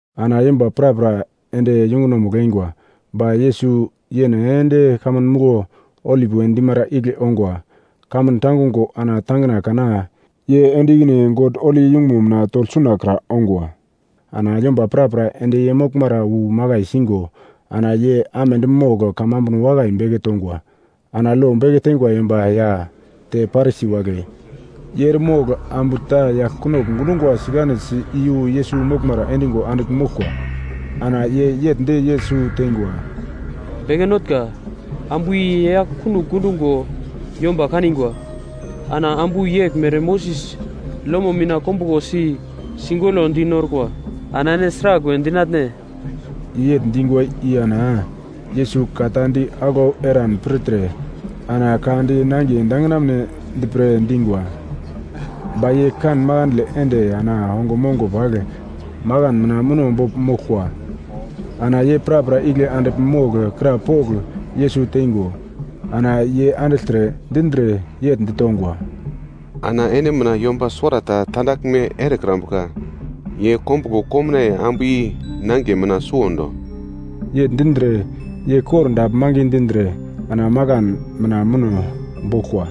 Ana yomba prapra ende yungunomugl eingwa. Ba Yesus yene ende kamun muglo, Olip we dimara igle ongwa. Kamun tangungo ana tangina kana, ye ende ikine God holi yungumo mina togl sunakra ongwa. Ana yomba prapra ende ye moglmara wu makai singo ana ye amedi mogl kamambuno wakai beke tongwa. Ana lo beke teingwa yomba ya te Parisi wagle, ye eremogl ambu ta yagl kunogl gundungwa sikanesi iyu Yesus moglmara endingo andigl moglkwa. Ana ye yegl di Yesus teingwa, “Beke Notnga, ambu i ye yagl kunogl gundungo yomba kanigwa. Ana ambu yeglmere Moses lomo mina kombuglo si, sigoglo di norkwa. Ana ene sragl we dinatne?” Ye yegl dingwa i ana Yesus ka ta di aglau eran pirtre ana ka di nangiye dangina mounedi pre dingwa. Ba ye kan makandle ende ana ongo mongo pagl makan mina muno bogl moglkwa. Ana ye prapra igle andigl mogl krapogl Yesus teingo, ana ye andigltre dindre yegl ditongwa, “Ana ene mina yomba suwarata tandaglme erekrambuka, ye kombuglo komnaiye ambu i nangiye mina suwondo.” Yegl dindre, ye kordagl mangi dindre ana makan mina muno boglkwa.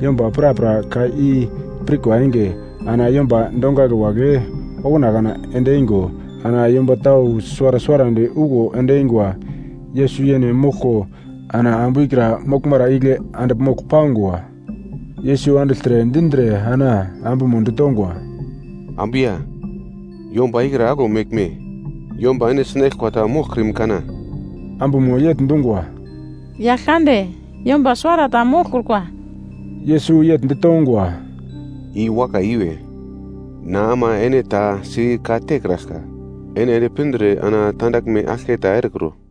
Yomba prapra ka i pirkwa enge, ana yomba dongagl wagle okuna kana ende eingo, ana yomba tau suwara suwarandi okuwo ende eingwa. Yesus yene moglko ana ambu ikra moglmara igle andigl mogl pangwa. Yesus andigltre dindre ana ambumo ditongwa, “Ambu ya, yomba ikra aglo meglme? Yomba ene sinaglkwa ta moglkrim kana?” Ambumo yegl dungwa, “Yaglkande, yomba suwarata moglkrikwa.” Yesus yegl ditongwa, “I wakai iwe, na ama ene ta si ka-tekraglka, ene ende pindre ana tandaglme aglketa erekro.”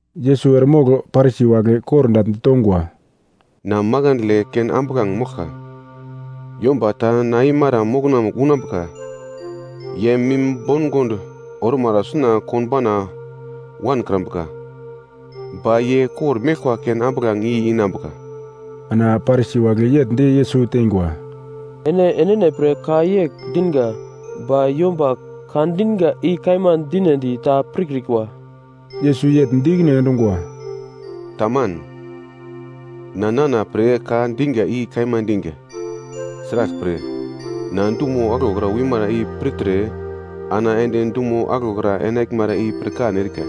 Yesus eremogl Parisi wagle kordagl ditongwa, “Na makandle ken ambuglange moglka, yomba ta na eimara mokonamugl unambuka, ye mim bongond ormara suna konbauna wankrambuka. Ba ye kor-meglkwa ken ambuglange i inambuka.” Ana Parisi wagle yegl di Yesus teingwa, “Ene enene pre ka yegl dinga ba yomba ka dinga i kaima dinedi ta pirkrikwa.” Yesus yegl di ikine endungwa, “Taman, na nana pre ka dinga i kaima dinga. Sraglpre na dumo aglokra wimara i pirtre ana ende dumo aglokra enaglmara i pirkan erika.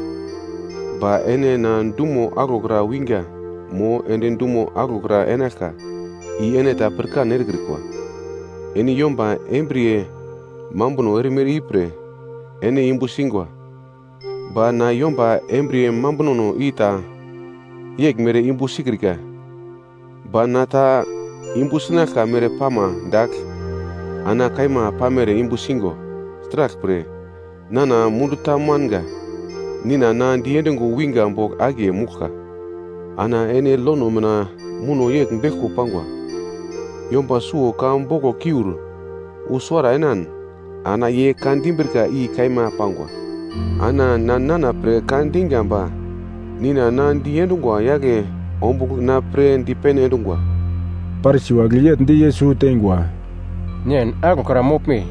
Ba ene na dumo aglokra winga mo ende dumo aglokra enaglka i ene ta pirkan erekrikwa. Ene yomba embriye mambuno erimere ipre ene yumbu singwa, ba na yomba embriye mambunono i ta yeglmere yumbu sikrika. Ba na ta yumbu sinaglka mere pama dagl, na kaima pamere yumbu singo, sraglpre, nana mundu ta manga, Nina na diendungo winga bogl akiye mouglka. Ana ene lono mina muno yegl beglko pangwa. Yomba suwo ka boglokiur wu suwara enan, ana ye ka dimbrika i kaima pangwa. Ana na nana pre ka dinga ba Nina na diendungwa yagle ombugl na pre dipene endungwa.” Parisi wagle yegl di Yesus teingwa, “Nen aglokra moglme?”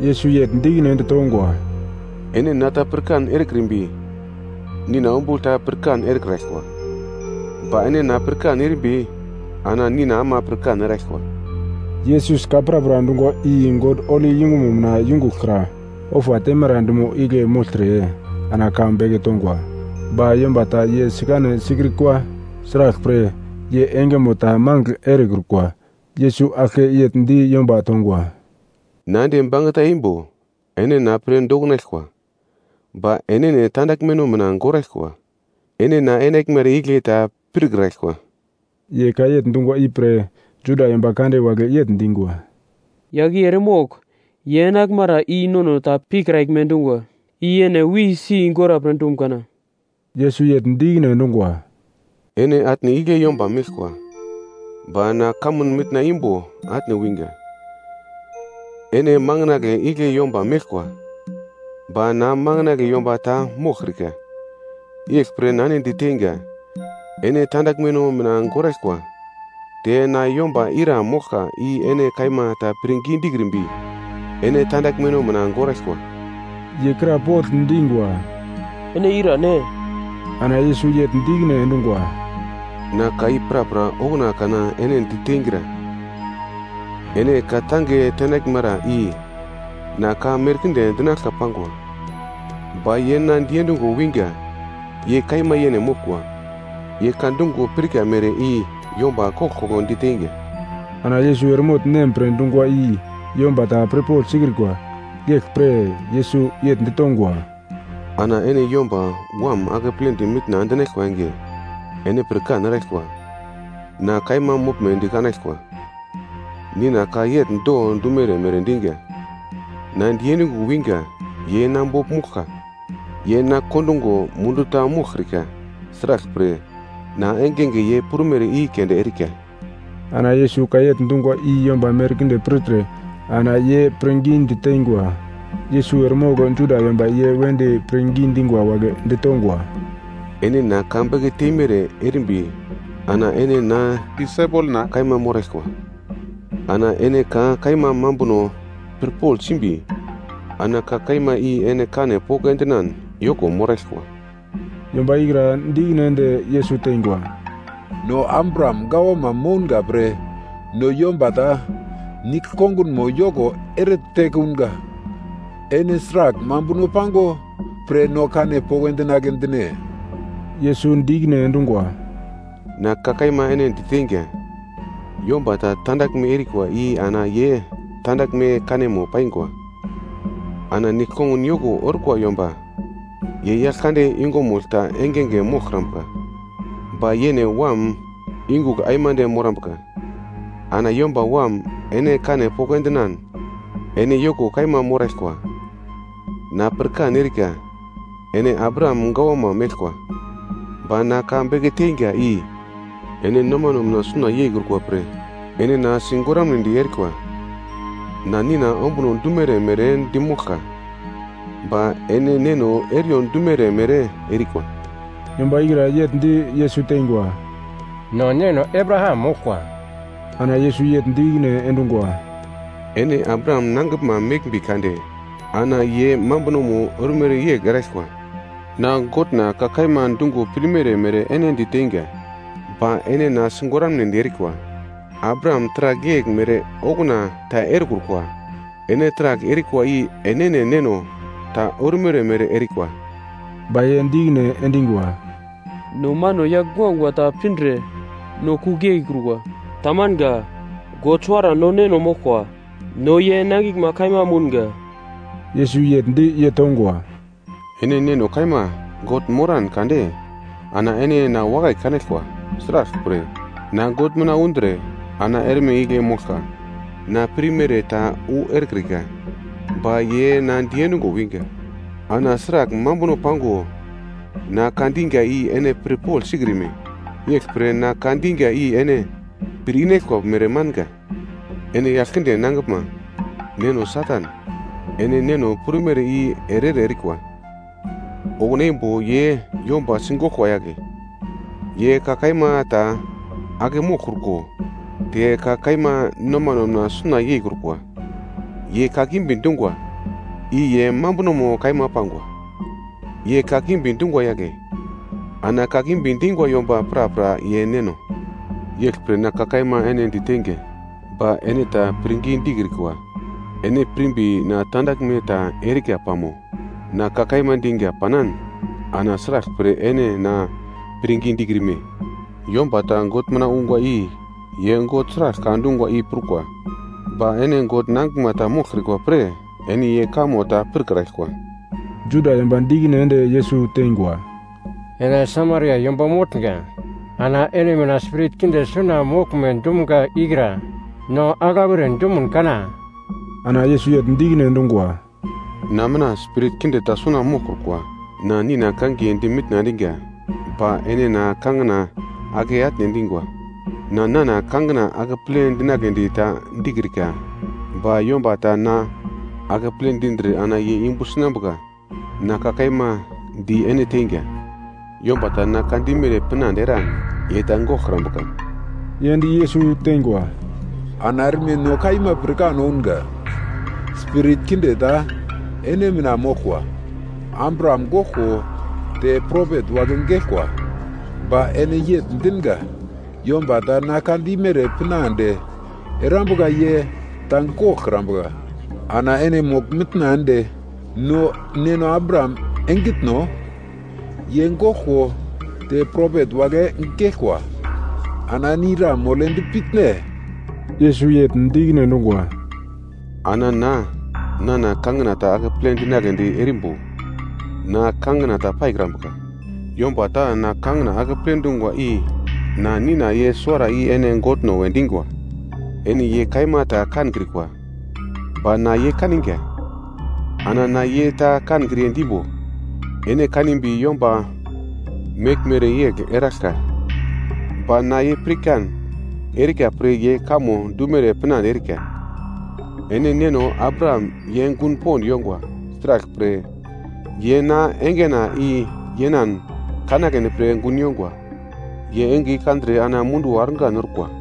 Yesus yegl di ikine ende tongwa, “Ene na ta pirkan erekrimbi, Nina ombugl ta pirkan erekraglkwa. Ba ene na pirkan erimbi ana Nina ama pirkan eraglkwa.” Yesus ka prapra dungwa i God holi yungumo mina yungugl kra, ofa teimara dumo igle mogltre ana ka beke tongwa. Ba yomba ta ye sikane sikrikwa sraglpre ye engemo ta magl erekrukwa. Yesus aglke yegl di yomba tongwa, “Na ende bangeta eimbo ene na pre doknaglkwa, ba enene tandaglmeno mina goraglkwa, ene na enaglmara igle ta pirkraglkwa.” Ye ka yegl dungwa ipre Juda yomba kande wagle yegl dingwa, “Yagl i eremogl ye enaglmara i nono ta pikraglme dungwa. I yene wisi gora pre dum kana?” Yesus yegl di ikine endungwa, “Ene atne igle yomba meglkwa, ba na kamun mitna imbo atne winga. Ene manginagle igle yomba meglkwa, ba na manginagle yomba ta moglkrika. Yeglpre na ene diteinga, ene tandaglmeno mina goraglkwa. Te na yomba ira moglka i ene kaima ta pirngi dikrimbi, ene tandaglmeno mina goraglkwa.” Ye krapogl dingwa, “Ene irane?” Ana Yesus yegl di ikine endungwa, “Na ka i prapra okuna kana ene di teingra. Ene ka-tange tenaglmara i, na ka merkinde dinaglka pangwa. Ba ye na diendungo winga, ye kaima yene moglkwa. Ye ka dungo pirka mere i yomba koglkoglo diteinga.” Ana Yesus eremogl Nem pre dungwa i yomba ta pirpogl sikrikwa. Yeglpre Yesus yegl ditongwa, “Ana ene Yomba Wam akepledi mitna endinaglkwa enge, ene pirkan eraglkwa. Na kaima moglmedi kanaglkwa, Nina ka yegl do dumere mere dinga. Na diendungo winga ye na bogl mouglka, ye na kondungo mundu ta moglkrika, sraglpre na engenge ye prumere i keunde erika.” Ana Yesus ka yegl dungwa i yomba merkinde pirtre ana ye pirngidi teingwa. Yesus eremogl Juda yomba ye wedi pirngi dingwa wagle ditongwa, “Ene na ka beke teimere erimbi ana ene na disaipelna kaima moraglkwa.” Ana ene ka kaima mambuno pirpogl simbi ana ka kaima i ene kane poko endinan yoko moraglkwa. Yomba ikra di ikine ende Yesus teingwa, “No Abraham gawama mounga pre no yomba ta nigl kongunmo yoko ere tekunga. Ene sragl mambuno pango pre no kane poko endinagle dine?” Yesus di ikine endungwa, “Na ka kaima ene di teinga, yomba ta tandaglme erikwa i ana ye tandaglme kanemo paingwa. Ana nigl kongun yoko orkwa yomba ye yagl kande yungumugl ta engenge moglkrambuka, ba yene wam yungugl aimande morambuka. Ana Yomba Wam ene kane poko endinan, ene yoko kaima moraglkwa. Na pirkan erika ene Abraham gawama meglkwa, ba na ka beke teinga i, ene nomano mina suna yeikrukwa pre ene na sigoramnedi erikwa. Na Nina ombuno dumere mere dimoglka, ba ene neno eriyo dumere mere erikwa.” Yomba ikra yegl di Yesus teingwa, “No neno Abraham moglkwa.” Ana Yesus yegl di ikine endungwa, “Ene Abraham nangiglma meglmbi kade, ana ye mambuno ormere yegl eraglkwa. Na Godna ka kaima dungo pirmere mere ene diteinga, ba ene na sigoramnedi erikwa. Abraham taragl yegl mere okuna ta erekrukwa. Ene taragl erikwa i enene neno ta ormere mere erikwa.” Ba ye di ikine endingwa, “No mano yagl guagua ta pindre no kugl yeikrukwa. Tamanga. God suwara no Neno moglkwa. No ye nangiglma kaima mounga.” Yesus yegl di ye tongwa, “Ene Neno kaima God moran kade ana ene na wakai kanaglkwa. Sraglpre, na God mina undre ana erme igle moglka. Na pirmere ta wu erekrika, ba ye na diendungo wingwa. Ana sragl mambuno pango na ka dinga i ene pirpogl sikrime? Yeglpre na ka dinga i ene pir inaglkwa mere manga. Ene yagl kinde nangiglma, neno Satan, ene neno prumere i ere-ere erikwa. Okuna imbo ye yomba sigoglkwa yagle, ye ka kaima ta ake moglkruko, te ka kaima nomano mina suna yeikrukwa. Ye kakimbi dungwa i ye mambunomo kaima pangwa. Ye kakimbi dungwa yagle, ana kakimbi dingwa yomba prapra ye neno. Yeglpre na ka kaima ene diteinga, ba ene ta pirngi dikrikwa. Ene pirmbi na tandaglme ta erika pamo? Na ka kaima dinga panan ana sraglpre ene na pirngi dikrime? Yomba ta God mina ungwa i ye God sragl ka dungwa i prukwa. Ba ene God nangiglma ta moglkrikwa pre ene ye kamo ta pirkraglkwa.” Juda yomba di ikine ende Yesus teingwa, “Ene Samaria yomba motnga, ana ene mina spirit kinde suna moglme dumga ikra no aglau ere dumun kana?” Ana Yesus yegl di ikine endungwa, “Na mina spirit kinde ta suna moglkrukwa, na Nina kangiye di mitna endinga ba ene na kangina ake atne endingwa. Na nana kangina akeple dinagledi ta dikrika ba yomba ta na akeple dindre ana ye yumbu sinambuka. Na ka kaima di ene teinga, yomba ta na ka dimere pinande eran ye ta goglkrambuka.” Ye di Yesus teingwa, “Ana erme no kaima pirkan ounga, spirit kinde ta ene mina moglkwa. Abraham goglko, te propet wagle geglkwa, ba ene yegl dinga. Yomba ta na ka dimere pinande erambuka ye ta goglkrambuka. Ana ene mogl-mitna ende no neno Abraham engitno? Ye goglko te propet wagle geglkwa ana ene ira moledi pitne?” Yesus yegl di ikine endungwa, “Ana na, nana kangina ta akeple dinagledi erimbo na kangina ta paikrambuka. Yomba ta na kangina akeple dungwa i na Nina. Ye suwara i ene Godno we dingwa. Ene ye kaima ta kankrikwa, ba na ye kaninga. Ana na ye ta kankriye dimbo, ene kakimbi yomba meglmere yegl eraglka. Ba na ye pirkan erika pre ye kamo dumere pinande erika. Ene neno Abraham ye gun pond yongwa, sraglpre ye na engena i yenan kanagledi pre gun yongwa. Ye enge i kandre ana munduwo argan orkwa.”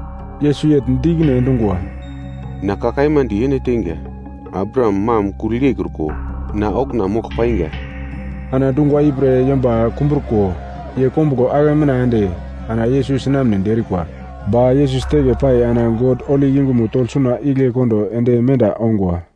Yesus yegl di ikine endungwa, “Na ka kaima di ene teinga, Abraham mam kugl yeikruko, na okuna mogl painga.” Ana dungwa ipre yomba kumbruko ye kombuglo ake mina ende ana Yesus sinamnedi erikwa, ba Yesus teke pai ana God holi yungumo togl suna igle kondo ende menda ongwa.